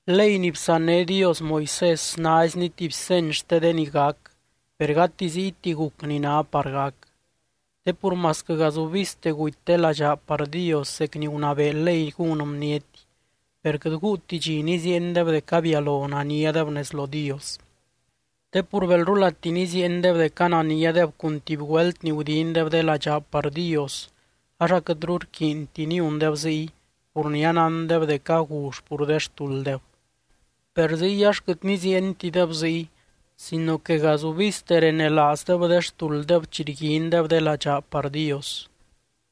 Ley ni bsanné Dios Moisés naizni tuby seny xte de ni gac, per gati ziyti guc ni ná par gac. Te pur masquɨ gazubizte guty de ladxaa par Dios zec ni gunabee ley gún bniety, per quɨt guuti dxi niziiendeb dec abialo naniadeb nez lo Dios. Te pur belrulati niziiendeb dec ananiadeb cun tuby güelt ni gudindeb de ladxaa par Dios, ax aquɨtru rquiinti niundeb ziy pur ni anándeb dec agull pur de xtulddeb. Per ziy ax quɨt niziientideb ziy sino que gazubizte renelaazdeb de xtulddeb chi rguindeb de ladxaa par Dios,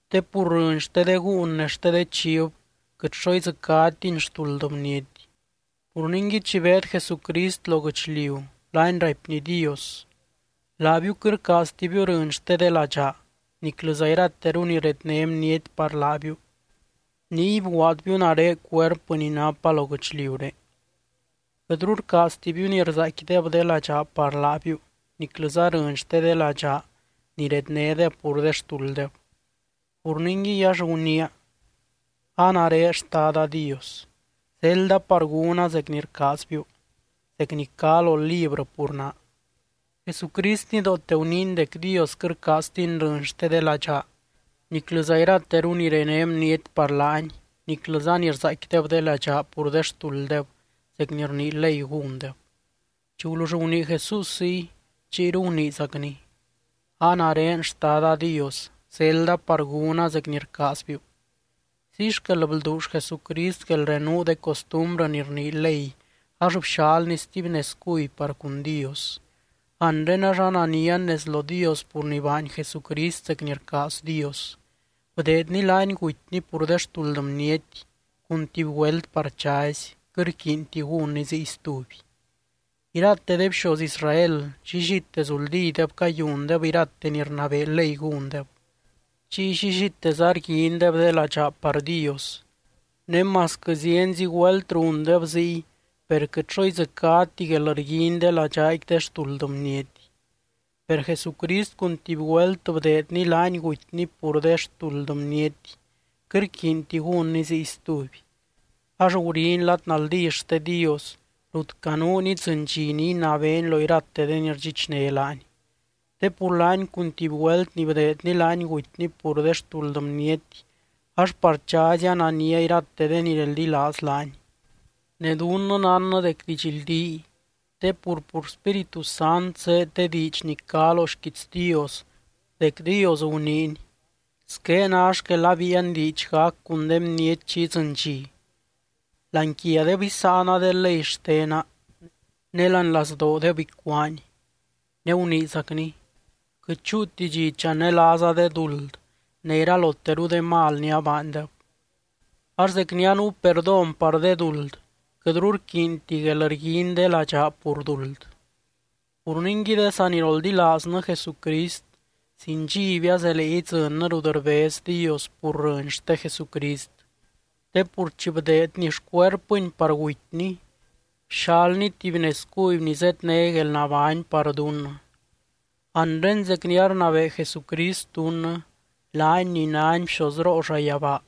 te pur rɨny xte de gúun ne xte de chiv quɨt xo idzɨcátini xtuld bniety. Pur ningui, chi beed Jesucrist lo guɨchliu laany raipny Dios: Laabiu quɨt rcaaztibiu rɨny xte de ladxaa niclɨza irateru ni redné bniety par laabiu, niy bguaadbiu nare cuerpɨ ni napa lo guɨchliuré. Quɨtru rcaaztibiu ni rzaaicquideb de ladxaa par laabiu niclɨza rɨny xte de ladxaa ni rednédeb pur de xtulddeb. Pur ningui, ax guniia: “A nare, Xtada Dios, zelda par gúna zec ni rcaazbiu, zec ni cá lo librɨ pur naa.” Jesucrist nidoote guniiny dec Dios quɨt rcaaztiny rɨny xte de ladxaa, niclɨza irateru ni rené bniety par laany, niclɨza ni rzaaicquideb de ladxaa pur de xtulddeb zec ni rnii ley gúndeb. Chi gulull gunii Jesús ziy, chiyru guniizacny: “A nare, Xtada Dios, zelda par gúna zec ni rcaazbiu.” Ziy xquel blduull Jesucrist guelrenuu de costumbrɨ ni rnii ley ax bxalny stuby nez cuby par cun Dios. Anre ax ananian nez lo Dios pur ni baany Jesucrist zec ni rcaaz Dios, bdeedny laany gutyny pur de xtuld bniety cun tuby güelt par chazy, quɨt rquiinti gúnny ziy stuby. Irate de bxoz Israel llillite zuldideb cayundeb irate ni rnabee ley gúndeb, chiy llilliteza rguindeb de ladxaa par Dios. Ne masquɨ zienzi güelt rundeb ziy, per quɨt xo idzɨcáti guelrguiny de ladxaaqui de xtuld bniety. Per Jesucrist cun tuby güelt bdeedny laany gutyny pur de xtuld bniety, quɨt rquiinti gúnny ziy stuby. Ax guriny lad naldí xte Dios rut canuuny idzɨny dxi ni inabeeny lo irate de ni rdxichné laany. Te pur laany cun tuby güelt ni bdeedny laany gutyny pur de xtuld bniety, ax par chazy anania irate de ni reldilaaz laany. Ne dunnɨ nánnɨ dec didxldíy te pur, pur Spíritu Sant zéed de diidx ni cá lo xquiits Dios dec Dios guniiny: Squé ná xquel abíian diidx gac cun de bniety chi idzɨny dxi: Láani quiadeb isáana de ley xtena ne láani lazdoodeb icuáani. Ne guniizacny: Quɨt chúuti dxi chanelaaza de duld ne iraloteru de mal ni abaandeb. Ax zec ni anuu perdón par de duld, quɨtru rquiinti guelrguiny de ladxaa pur duld. Pur ningui, de saniroldilaaznɨ Jesucrist sin dxiby azelee idzɨnnɨ rut rbez Dios pur rɨny xte Jesucrist, te pur chi bdeedny xcuerpɨny par gutyny, bxalny tuby nez cuby ni zedné guelnabány par dunnɨ. Anre zec ni arnabee Jesucrist dunnɨ, laany ni nány bxozroo llayabaa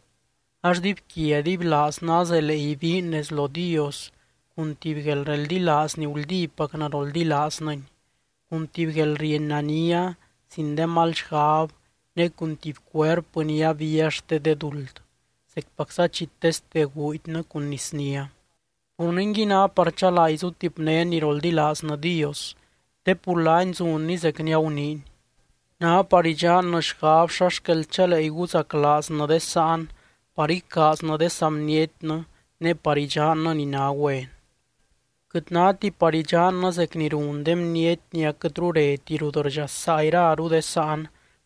ax dibyquia dibylaaznɨ azelee ibiin nez lo Dios cun tuby guelreldilaaz ni guldípacnɨ roldilaaznɨny, cun tuby guelrieny nania sin de mal xgab ne cun tuby cuerpɨ ni abía xte de duld, zecpacza chi teste guudynɨ cun nisnia. Pur ningui, ná par chalaa izutipnén ni roldilaaznɨ Dios, te pur laany zunny zec ni aguniiny. Ná par idxannɨ xgab xa xquel chalee iguzaclaaznɨ de sáan par icaaznɨ de saa bnietnɨ ne par idxannɨ ni ná güen. Quɨt náti par idxannɨ zec ni run de bniety ni aquɨtru reti rut rdxasaa iraru de sáan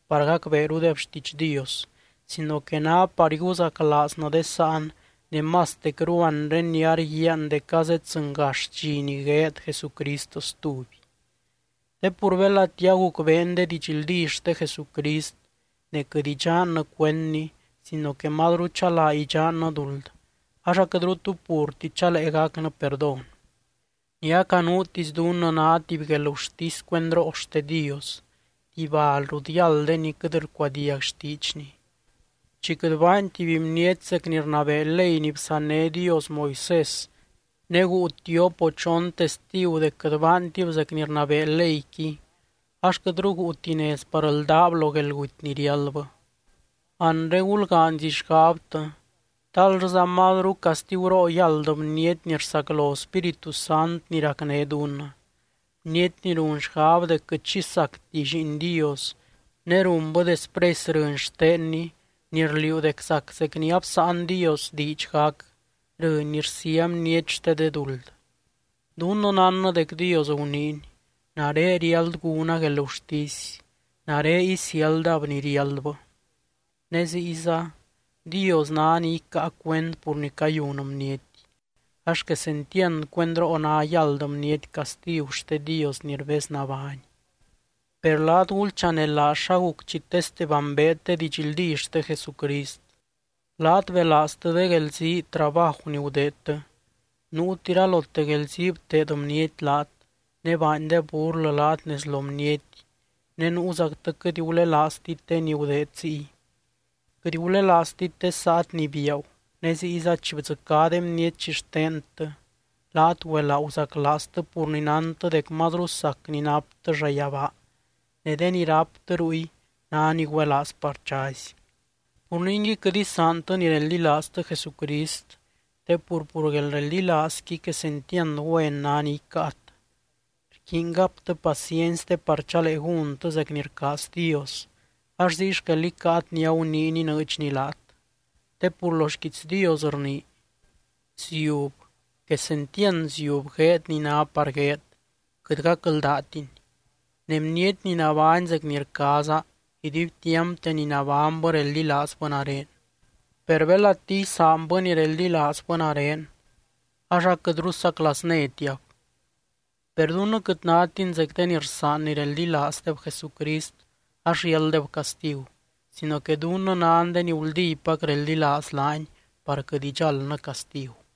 par gacbeerudeb xtiidx Dios, sino que ná par iguzaclaaznɨ de sáan, ne mastecru anre ni arguiaan dec azeddzɨngax dxi ni gueed Jesucrist stuby. Te pur belati agucbeen de didxldí xte Jesucrist ne quɨt idxannɨ cuendny sino que mazru chalaa idxannɨ duld, ax aquɨtru tu purti chalee gacnɨ perdón. Ni acanuutisy dunnɨ ná tuby guelgurtisy cuendroo xte Dios, tuby bal rut yáld de ni quɨt rcuadiag xtiidxny. Chi quɨt baany tuby bniety zec ni rnabee ley ni bsanné Dios Moisés, ne guu tiop o chon testigu dec quɨt baantib zec ni rnabee leyqui, ax quɨtru guuti nez par ldáb lo guelguty ni riáldbɨ. Anre gulgaanyzi xgabtɨ, ¿tal llɨza mazru castiguroo yáld bniety ni rsaclo Spíritu Sant ni racné dunnɨ, bniety ni run xgab dec quɨt xi sacti Lliin Dios, ne runbɨ despresy rɨny xtenny ni rliuu dec zac zec ni absáan Dios diidx gac, rɨny ni rsía bniety xte de duld? Dunnɨ nánnɨ dec Dios guniiny: “Nare riáld gúna guelgurtisy, nare isiáldab ni riáldbɨ.” Ne ziyza: “Dios ná ni icáa cuend pur ni cayun bniety.” ¡Ax quesentiand cuendroo ná yáld bniety castigu xte Dios ni rbeznabány! Per laat, gulchanelaaz xa guc chi teste bambeet de didxldí xte Jesucrist. Laat belaaztɨ de guelzii trabaju ni gudeedtɨ. Nuut iralote guelzii bteed bniety laat, ne baandeb burlɨ laat nez lo bniety, ne nuuzactɨ quɨt gulelaaztit de ni gudeed ziy. Quɨt gulelaaztit de saat ni biaagu, ne ziyza chi bdzɨcá de bniety xixtentɨ laat güelaa guzaclaaztɨ pur ni nántɨ dec mazru sac ni naptɨ llayabaa, ne de ni ráptɨ ruy ná ni güelaaz par chazy. Pur ningui, quɨt isaantɨ ni reldilaaztɨ Jesucrist te pur, pur guelreldilaazqui quesentiand güen ná ni icáat. Rquiiny gaptɨ paciency te par chalee gúntɨ zec ni rcaaz Dios, ax ziy xquel icáat ni aguniiny inɨɨdxny laat. Te pur lo xquiits Dios rnii: Ziub, quesentiand ziub gueed ni ná par gueed, quɨt gacldaatiny. Ne bniety ni nabány zec ni rcaaza, iduibtiampte ni nabánybɨ reldilaazbɨ nare. Per belati isaanbɨ ni reldilaazbɨ nare, ax aquɨtru saclaaznétiab. Per dunnɨ quɨt nátin zec de ni rsaan ni reldilaazdeb Jesucrist ax riálddeb castigu, sino que dunnɨ nan de ni guldípac reldilaaz laany par quɨt idxáldnɨ castigu.